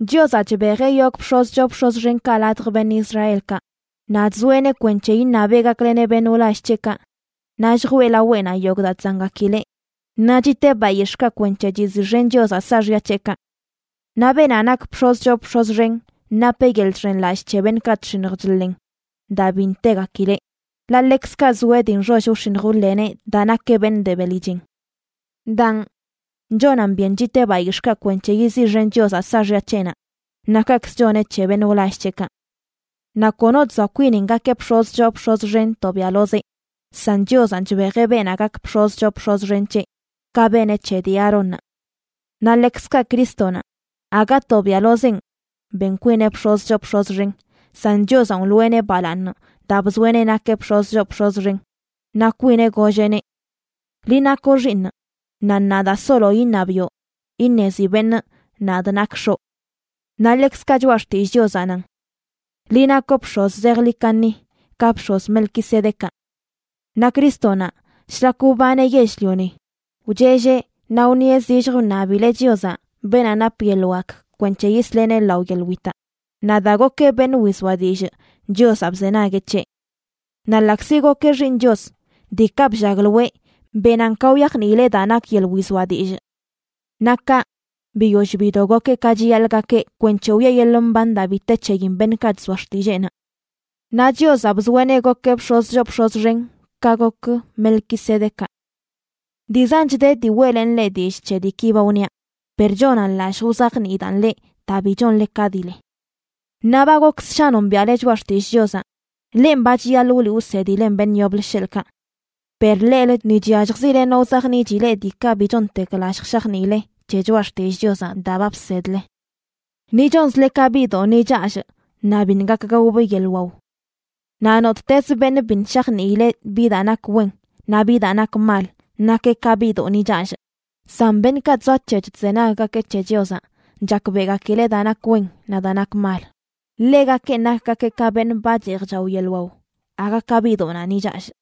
Chiozaꞌ chbejeꞌ yogꞌ bx̱oz choo bx̱oz xenkaꞌ ladj beṉꞌ Israelkaꞌ, naꞌ chzoeꞌneꞌ kwenc̱he iṉabeꞌ gakleneꞌ beṉꞌ wlall c̱heꞌkaꞌ naꞌ lljwee laweꞌnaꞌ yogꞌ daa chzangakileꞌ, naꞌ chiteꞌ bayix̱ꞌkaꞌ kwenc̱he chiziꞌxen Chiozaꞌ saaxya c̱heꞌkaꞌ. Naꞌ beenaꞌ nak bx̱oz choo bx̱oz xen napeꞌ yeḻꞌ chxenlallꞌ c̱he beṉꞌkaꞌ chx̱iṉj chḻen daa bi ntegakileꞌ, ḻaꞌ ḻekzkaꞌ zoeꞌ dii nxoll wx̱iṉj wḻeneꞌ daa nakeꞌ beṉꞌ de beli chen. Daan, chonan byen chiteꞌ bayix̱ꞌkaꞌ kwenc̱he yiziꞌxen Chiozaꞌ saaxya c̱heꞌnaꞌ, naꞌ kaꞌkz choneꞌ c̱he beṉꞌ wlall c̱heꞌkaꞌ. Naꞌ kono chzoa kwinin gakeꞌ bx̱oz choo bx̱oz xen tobiaꞌlozeꞌ, san Chiozanꞌ chbejeꞌ beenaꞌ gak bx̱oz choo bx̱oz xen c̱heꞌ, ka beneꞌ c̱he dii Aarónnaꞌ. Naꞌ ḻekzkaꞌ Crístonaꞌ, aga tobiaꞌlozenꞌ ben kwineꞌ bx̱oz choo bx̱oz xen, san Chiozanꞌ wloꞌeneꞌ balaaṉ daa bzoeꞌneꞌ nakeꞌ bx̱oz choo bx̱oz xen. Naꞌ kwineꞌ golleꞌneꞌ: Liꞌ nakoꞌ Xiiṉꞌ, naꞌ ṉaa daa solo iṉabiꞌo iṉezi beṉꞌ nadꞌ nakꞌ X̱oꞌ. Naꞌ ḻekzkaꞌ Choꞌa Xtillꞌ Chiozaꞌ nan: Liꞌ nakoꞌ bx̱oz zejḻi kaṉi, ka bx̱oz Melquisedecaꞌ. Naꞌ Crístonaꞌ, shlak wbaneꞌ yell-lioni, wchelleꞌ naꞌ wṉieꞌ zilljə, wṉabileꞌ Chiozaꞌ, beenaꞌ nap yeḻꞌ wak kwenc̱he yisleꞌneꞌ lao yeḻꞌ witaꞌ, naꞌ daa gokeꞌ beṉꞌ wizoa dillꞌ, Chiozaꞌ bzenagueꞌ c̱heꞌ. Naꞌ ḻaꞌkzi gokeꞌ Xiiṉ Chios, diikaꞌ bllagloeꞌ benan ka wyajniileꞌ daa nak yeḻꞌ wizoa dillꞌ. Naꞌ kaꞌ, biyoll bido gokeꞌ ka chiyaḻꞌ gakeꞌ kwenc̱he wiꞌe yeḻꞌ mban daa bi te c̱heyin beṉꞌkaꞌ chzoa xtilleenaꞌ. Naꞌ Chiozaꞌ bzoeꞌneꞌ gokeꞌ bx̱oz choo bx̱oz xen ka gok Melquisedecaꞌ. Dii zanch de dii weꞌlenꞌ leꞌ dillꞌ c̱he diiki ba wniaꞌ, per chonan lallj wzajniidaꞌn leꞌ daa bi chonle ka dii le. Ṉaa ba gok ssha nombiaꞌle choꞌa xtillꞌ Chiozaꞌ, lenꞌ ba chiyaḻꞌ wliꞌ wsedilen beṉꞌ yoblə, sheḻꞌkaꞌ. Per leꞌlə ni chyalljzile no wzajniꞌchi leꞌ diikaꞌ bi chontek lallj shajniile c̱he choꞌa xtillꞌ Chiozaꞌ daa ba bsedle. Ni chonzle ka biꞌdoꞌ ni challꞌ naꞌ biṉꞌ gak gaobꞌ yeḻꞌ wao. Naꞌ nottezə beṉꞌ biṉꞌ shajniileꞌ bi daa nak wen naꞌ bi daa nak mal nakeꞌ ka biꞌdoꞌ ni challꞌ. San beṉꞌkaꞌ chzoac̱hec̱h chzenaggakeꞌ c̱he Chiozaꞌ, chakbeꞌgakileꞌ daa nak wen naꞌ daa nak mal. Ḻegakenꞌ nakgakeꞌ ka beṉꞌ ba cheej chao yeḻꞌ wao, aga ka biꞌdoꞌnaꞌ ni challꞌ.